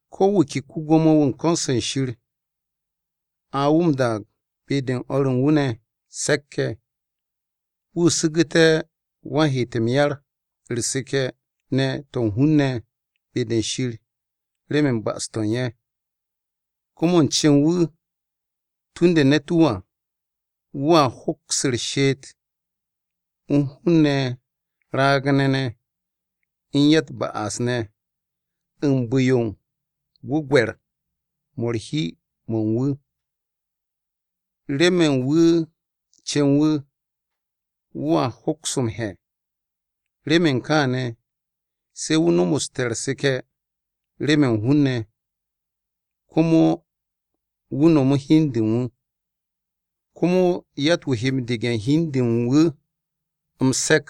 Ko̱ wu̱ ke ko-Gwo̱mo-wu̱ u̱n ko̱n-se Shir, a wu̱ m-daag be-de u̱n o̱r u̱n wu̱ ne̱ se̱k-ye̱. Wu̱ su̱gu̱te̱ wan-heet m-yar, u̱r-seke̱ ne̱ to̱ u̱n hun-ne̱ be-de Shir remen ba'as-to̱ u̱n ye̱. Komo u̱n cen wu̱ u̱ntu̱ no̱me̱ ne̱t-wu̱ à, wu̱a hoks u̱r-she'et u̱n hun-ne̱ raag-ne̱ ne̱ u̱n ya-u̱t-ba'as ne̱ u̱n bu̱-yo gwu̱gwe̱r-mo̱ u̱r-hi mo̱ u̱n wu̱. Remen wu̱ u̱n cen wu̱, wu̱a hoks m-he̱. Remen kaane̱, se̱ wu̱ nomoste̱ u̱r-seke̱ remen hun-ne̱, komo wu̱ nomo hi u̱n de u̱n wu̱. Komo yatt-wu̱ he m-dege̱ u̱n hi u̱n de u̱n wu̱ m-se̱k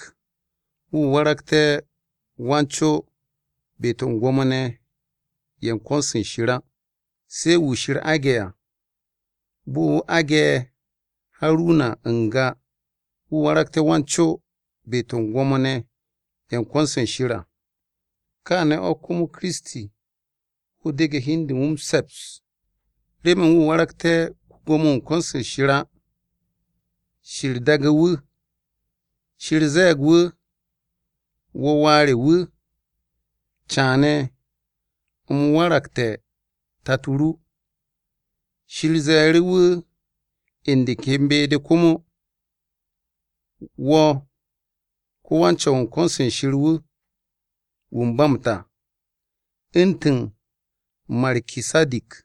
wu̱ waragte̱ Wan-co be-to̱ u̱n Gwo̱mo-ne̱ ye̱ u̱n ko̱n-se Shir á. Se̱ wu̱ Shir aage̱ à, bo̱ wu̱ aage̱ Haruna n-ga wu̱ waragte̱ Wan-co be-to̱ u̱n Gwo̱mo-ne̱ ye̱ u̱n ko̱n-se Shir à. Kaane̱ o̱ komo Kiristi wu̱ dege̱ hi u̱n de u̱n wu̱ m-se̱ps, remen wu̱ waragté̱ ko-Gwo̱mo-wu̱ u̱n ko̱n-se Shir á. Shir daage̱ wu̱. Shir ze̱e̱g wu̱, “Wo̱ Wà re wu̱. Caane̱ u̱m waragte̱ Tato ru.” Shir ze̱e̱ru̱ wu̱ u̱n de ken be-de komo, “Wo̱ ko-wan-Co̱w u̱n ko̱n-se Shir wu̱, wu̱ u̱n ba m-ta. Wo̱ ro̱ u̱ntu̱n Markisadik.”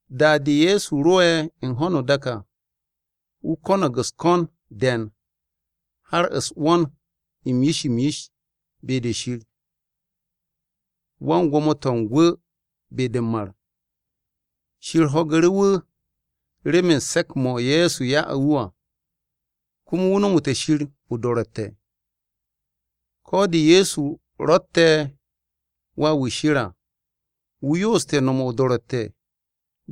Da-de Ye̱so ro'e̱ u̱n ho̱no o-dak à, wu̱ ko̱no̱g u̱s-ko̱n de̱e̱n har u̱s-'wo̱n m-yish m-yish be-de Shir wan-gwo̱mo-to̱ u̱n gwu̱ be-de m-mar. Shir ho̱gu̱ru̱ wu̱ remen se̱k-mo̱ Ye̱so ya'u̱ wu̱ à, komo wu̱ nomote̱ Shir o-do̱ro̱tte̱. Ko̱ de Ye̱so ro̱tte̱ Wà-wu̱ Shir à, wu̱ yooste̱ no̱m o-do̱ro̱tte̱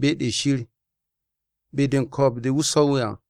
be-de Shir be-de u̱n ko̱o̱b-de wu̱ swo̱ à.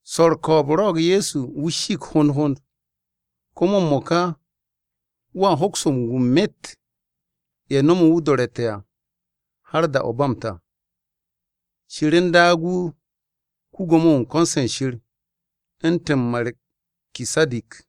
Swo̱ u̱r-ko̱o̱b rwo̱'o̱g Ye̱so wu̱ shiig hond hond, komo m-mo̱ka wu̱a hoks m-gu u̱n myet ye̱ no̱mu̱ wu̱ o-do̱ro̱tte̱ à, har da-o̱ ba m-ta. Shir u̱n daag wu̱ ko-Gwo̱mo-wu̱ u̱n ko̱n-se Shir u̱ntu̱n Markisadik.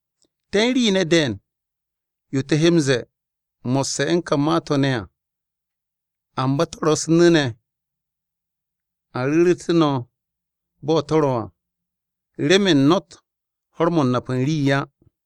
Te̱ u̱n rii ne̱ de̱e̱n yo te̱ he m-ze̱e̱ mo̱sse̱ u̱n ka ma-to̱ ne̱ à, amba to̱ ro̱ u̱s-nu̱ ne̱ a ru̱ru̱te̱ no̱ bo̱ to̱ ro̱ à remen no̱tt ho̱r-mo̱ nap u̱n rii á.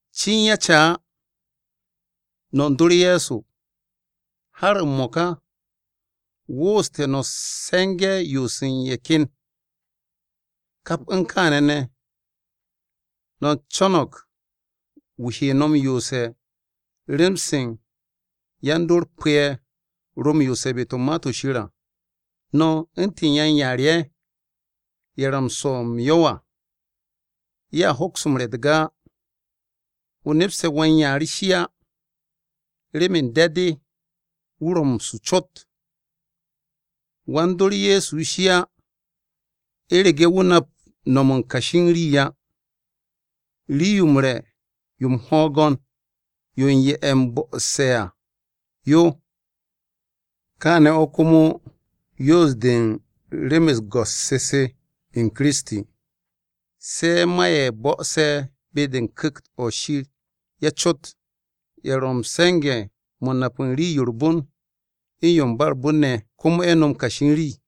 Cin ya ca á, no̱ u̱n dor Ye̱so har m-mo̱ka, wooste̱ no̱ se̱nge̱ yoose̱ u̱n ye̱ ken. Kap u̱n kaane̱ ne̱, no̱ u̱n co̱no̱g wu̱ he no̱ m-yoose̱ rem-se yan-dor pu̱-ye̱ ro̱ m-yoos be-de u̱n Ma-to̱ Shir à. No̱ u̱ntu̱n yan-yaar ye̱, ye̱ ro̱ m-swo̱ m-yo̱w à, ye̱a hoks m-re̱ u̱t-ga á. O nepste̱ wan-yaar shi á, remen de̱-de wu̱ ro̱ m-su cot. Wan-dor Ye̱so shi á u̱rege̱ wu̱ nap no̱m u̱n kashi rii á. Rii-yo m-re̱ yo m-'hwo̱'o̱go̱n yo u̱n ye̱ bo̱'o̱se̱ à yo. Kaane̱ o̱ komo yoos-de u̱n rem-u̱s go̱s-se se u̱n Kiristi, se ma ye̱ bo̱'o̱se̱ be-de u̱n Ku̱kt-o Shir ye̱ cot, ye̱ ro̱ m-se̱nge̱ mo̱ u̱n nap rii-yo u̱r-bon u̱n yo u̱n ba u̱r-bon ne̱, komo ye̱ no̱m kashi u̱n rii.